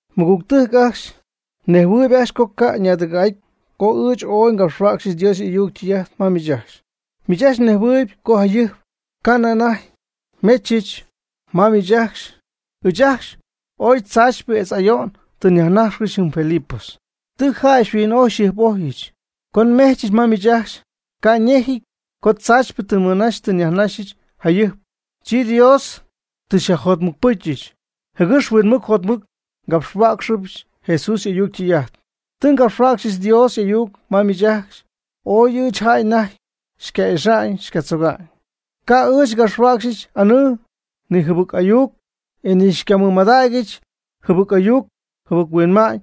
Mɨgügtɨjc ajcxy, mnejhuɨɨyb ajcxy co ca' ñaadɨgɨ̈'aty, co ɨɨch oy ngapxhuäcxy Dios y'ayuc ytɨy'ajt ma miich ajcxy. Miich ajcxy mnejhuɨɨyb co jayɨjp ca'nɨ anajty nmechɨch ma miich ajcxy ɨɨch ajcxy ooy tzaachypɨ etz ayo'n tɨ nyajnajxcɨxy jɨm Filipos. Tɨ jäy xyhuin'ojy xyjɨjp'ojyɨch. Co nmejchɨch ma miich ajcxy, ca' ñejɨty co tzaachypɨ tɨ nmɨnaxyɨch tɨ nyajnaxyɨch jayɨjp, chi Dios tɨ xyajjotmɨcpɨcyɨch, jɨgɨx huinmɨc jotmɨc ngapxhuäcxɨbɨch Jesús y'ayuc ytɨy'ajt. Tɨ ngapxhuäcxyɨch Dios y'ayuc ma miich ajcxy, oy ɨɨch jäy anajty xyca'ixa'ñ xycatzoga'ñ. Ca' ɨɨch ngapxhuäcxyɨch anɨɨ, ni jɨbɨc ayuc, e ni ngamɨydägyɨch jɨbɨc ayuc jɨbɨc huinma'ñ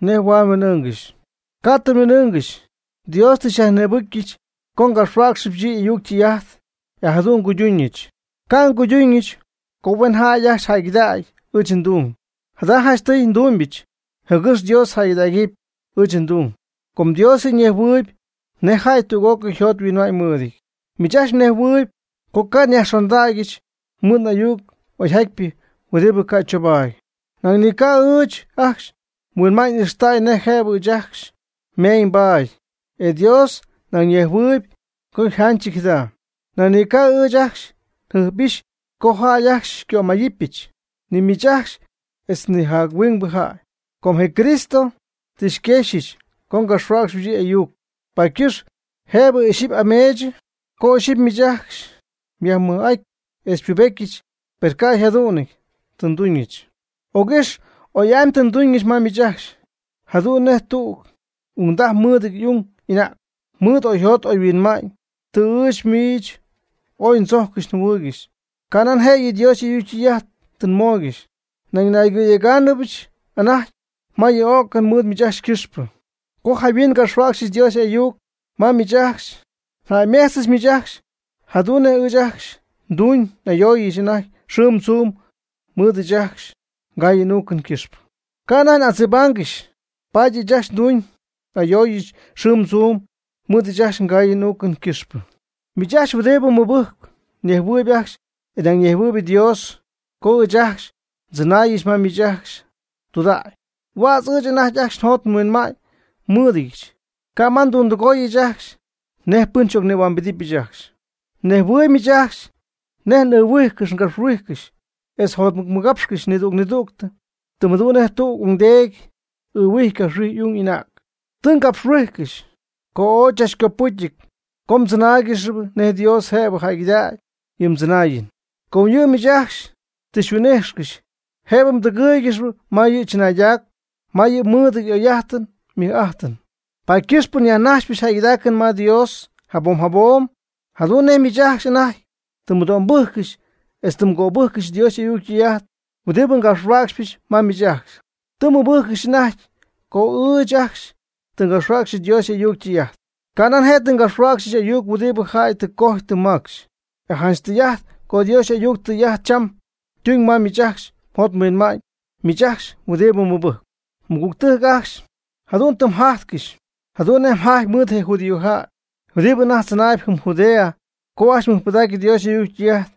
nej huaad nhuin'ɨɨngɨxy. Ca' tɨ nhuin'ɨɨngɨxy. Dios tɨ xyajnïbɨcyɨch co ngapxhuäcxɨbɨch yɨ' y'ayuc ytɨy'ajt, e jadu'n nguyduuñɨch. Ca' nduuñɨch co huen jäy ajcxy jäygɨdägy ɨɨch ndung. Jada janchtɨy ndumybɨch jɨgɨx Dios jäygɨdägɨpy ɨɨch ndung. Com Dios yɨ' ñejhuɨɨyb nej jäy tüg'ócɨy yjot yhuinma'ñ mɨɨdɨty. Miich ajcxy mnejhuɨɨyb co ca' nyajxondaaccɨxy mɨɨd ayuc oyjatypɨ huɨdi ca' choobaady. Nañ ni ca' ɨɨch ajcxy nhuinma'ñ 'ijxtäy nej jëbɨ ɨɨch ajcxy nmeeñybaat. E Dios nañ ñejhuɨɨyb co yjanchɨty jada. Nañ ni ca' ɨɨch ajcxy njɨjp'ixy co jäy ajcxy xycömayɨpyɨch, ni miich ajcxy etz ni jac-huingbɨ jäy. Com je Cristo tɨ xyquexyɨch co ngapxhuäcxɨbɨch yɨ' y'ayuc, paady ycɨxp jëbɨ ixyipy n'ane'myɨch co ixyipy miich ajcxy xyajmɨj'atyɨch etz xypubetyɨch, per ca' jadu'n tɨ nduuñɨch. Oygɨ́xy oy'amy tɨ nduuñɨch ma miich ajcxy, jadu'n nej tüg ungdaj mɨɨdɨty y'ung y'anäg mɨɨd oyjot oyhuinma'ñ. Tɨ ɨɨch miich ooy ndzojccɨxy njɨhuɨɨygɨxy, canan jëyɨ Dios y'ayuc ytɨy'ajt tɨ nmooygɨxy, nañ naygɨ̈yegáanɨbɨch anajty ma yɨ o'cɨn mɨɨd miich ajcxy ycɨxpɨ. Co jayhuin ngapxhuäcxyɨch Dios y'ayuc ma miich ajcxy, mjäymejchpy miich ajcxy jadu'n nej ɨɨch ajcxy nduuñ n'ayooyɨch anajty xɨɨm tzuum mɨɨd ɨɨch ajcxy ngaayɨn n'uucɨn ycɨxpɨ. Ca' anajty n'adzibaangɨxy, paady ɨɨch ajcxy nduuñ n'ayooyɨch xɨɨm tzuum mɨɨd ɨɨch ajcxy ngaayɨn n'uucɨn ycɨxpɨ. Miich ajcxy huɨdibɨ mɨbɨjcp mnejhuɨɨy ajcxy, e nañ ñejhuɨɨyb Dios, co ɨɨch ajcxy ndzɨnaayɨch ma miich ajcxy tudägy, huädz ɨɨch anajty ajcxy njot nhuinma'ñ mɨ́ɨdɨdyɨch. Ca' ma ndundɨgooyɨch ajcxy nej pɨn xy'ocnïhuambedɨpyɨch ajcxy. Mnejhuɨɨyb miich ajcxy nej n'ɨɨhuijcɨxy ngapxhuijcɨxy etz njotmɨcmɨgapxcɨxy nidüg nidüg, tɨm jadu'n nej tüg ungdeedy ɨɨhuijy capxhuijy y'ung y'anäg. Tɨ ngapxhuijcɨxy co ooy chach copɨcyɨty co mdzɨnáaygɨxɨpy nej Dios jëbɨ jäygɨdägɨpy yɨ mdzɨnaayɨn. Com yɨ' miich ajcxy tɨ xyhuin'ijxcɨxy jëbɨ mdɨgɨ́ɨygɨxɨpy ma yɨ' chɨnaaydac, ma yɨ' mɨɨdɨty y'oy'ajtɨn ymɨj'ajtɨn. Paady ycɨxpɨ nyajnajxpɨch jäygɨdaacɨn ma Dios jabom jabom, jadu'n nej miich ajcxy anajty tɨ mmɨdo'mbɨjccɨxy etz tɨ mgöbɨjccɨxy Dios y'ayuc ytɨy'ajt huɨdi ngapxhuäcxɨch ma miich ajcxy. Tɨ mmɨbɨjccɨxy anajty co ɨɨch ajcxy tɨ ngapxhuäcxy Dios y'ayuc ytɨy'ajt. Canan je' tɨ ngapxhuäcxyɨch ayuc huɨdi jäy tɨ cojy tɨ macxy. E janch tɨy'ajt co Dios y'ayuc ytɨy'ajt cham ytuñ ma miich ajcxy mjot mhuinma'ñ, miich ajcxy huɨdibɨ mɨbɨjcp. Mɨgügtɨjc ajcxy, jadu'n tɨ mjajtcɨxy jadu'n nej yjajty mɨɨd je judíojäy huɨdibɨ anajty tzɨnaayb jɨm Judea co ajcxy mɨjpɨdägy Dios y'ayuc ytɨy'ajt,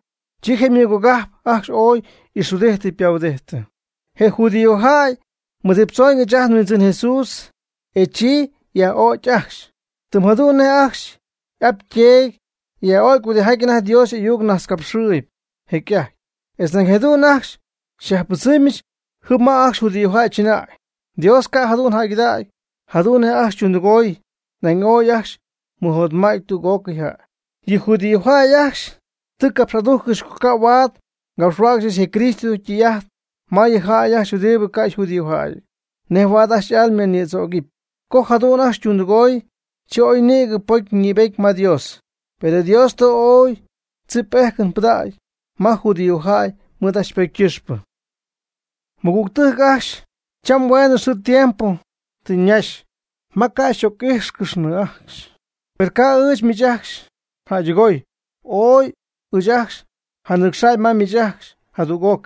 chi je ymɨgogajp ajcxy ooy y'ixhuɨdijtɨ ypahuɨdijtɨ. Je judíojäy ymɨdziptzoon ɨɨch ajt nHuindzɨn Jesús, e chi yaj'o'cy ajcxy, tɨm jadu'n nej ajcxy y'ap yteedy yaj'o'cy huɨdijaty anajty Dios y'ayuc najtzcapxɨɨyɨp jecy'ajty. Etz nañ jadu'n ajcxy xyajpɨdzɨmyɨch jɨm ma ajcxy judíojäy chɨnäy. Dios ca' jadu'n jäygɨdägy jadu'n nej ajcxy ytundɨgooy, nañ ooy ajcxy ymɨjotmädyii tüg'ócɨy jäy. Yɨ judíojäy ajcxy tɨ capx'adujccɨxy co ca' huaad ngapxhuäcxyɨch je Cristo ytɨy'ajt ma yɨ jäy ajcxy huɨdibɨ ca' yjudíojäyɨty, nej huaad ajcxy y'alma ñïdzóoccɨxɨpy. Co jadu'n ajcxy ytundɨgooy, chi ajcxy ooy nïgɨ ypocy ñïbety ma Dios. Per Dios tɨ ooy chip y'ejcɨn pɨdacy ma judíojäy mɨɨd ajcxy ypocy ycɨxpɨ. Mɨgüctɨjc ajcxy, cham hueenɨ xɨɨ tiempo tɨ ñaxy ma ca' n'oc'íjxcɨxnɨ ajcxy, per ca' ɨɨch miich ajcxy njäydɨgoy. Ooy ɨɨch ajcxy nja'nɨcxa'ñ ma miich ajcxy jadüg'oc,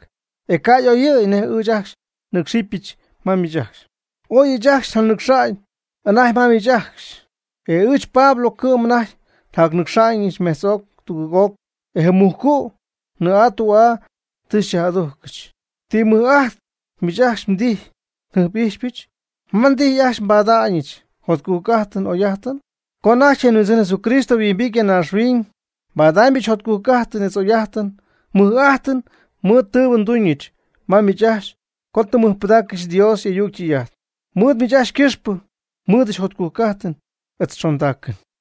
e ca' y'oyɨ̈y nej ɨɨch ajcxy nɨcxɨɨybɨch ma miich ajcxy. Ooy ɨɨch ajcxy njanɨcxa'ñ anajty ma miich ajcxy. E ɨɨch, Pablo, cɨ'm anajty njanɨcxa'ñɨch mejtz'oc tugɨɨg'oc, e je mujcu' nnɨɨ'aa ndü'aa tɨ xy'adujcɨch. ¿Ti mɨj'ajt miich ajcxy mdijy njɨjp'ijxpɨch? ¿Ma mdijy ajcxy nbada'ñɨch njotcujc'ajtɨn n'oy'ajtɨn? Co anajty ajt nHuindzɨn Jesucristo yhuimbity ya naaxhuiñ, nbadaamybɨch jotcujc'ajtɨn etz oy'ajtɨn mɨj'ajtɨn mɨɨd je tɨɨbɨ nduuñɨch ma miich ajcxy co tɨ mmɨjpɨdaaccɨxy Dios y'ayuc ytɨy'ajt. Mɨɨd miich ajcxy ycɨxpɨ nmɨɨdɨch jotcujc'ajtɨn etz xondaacɨn.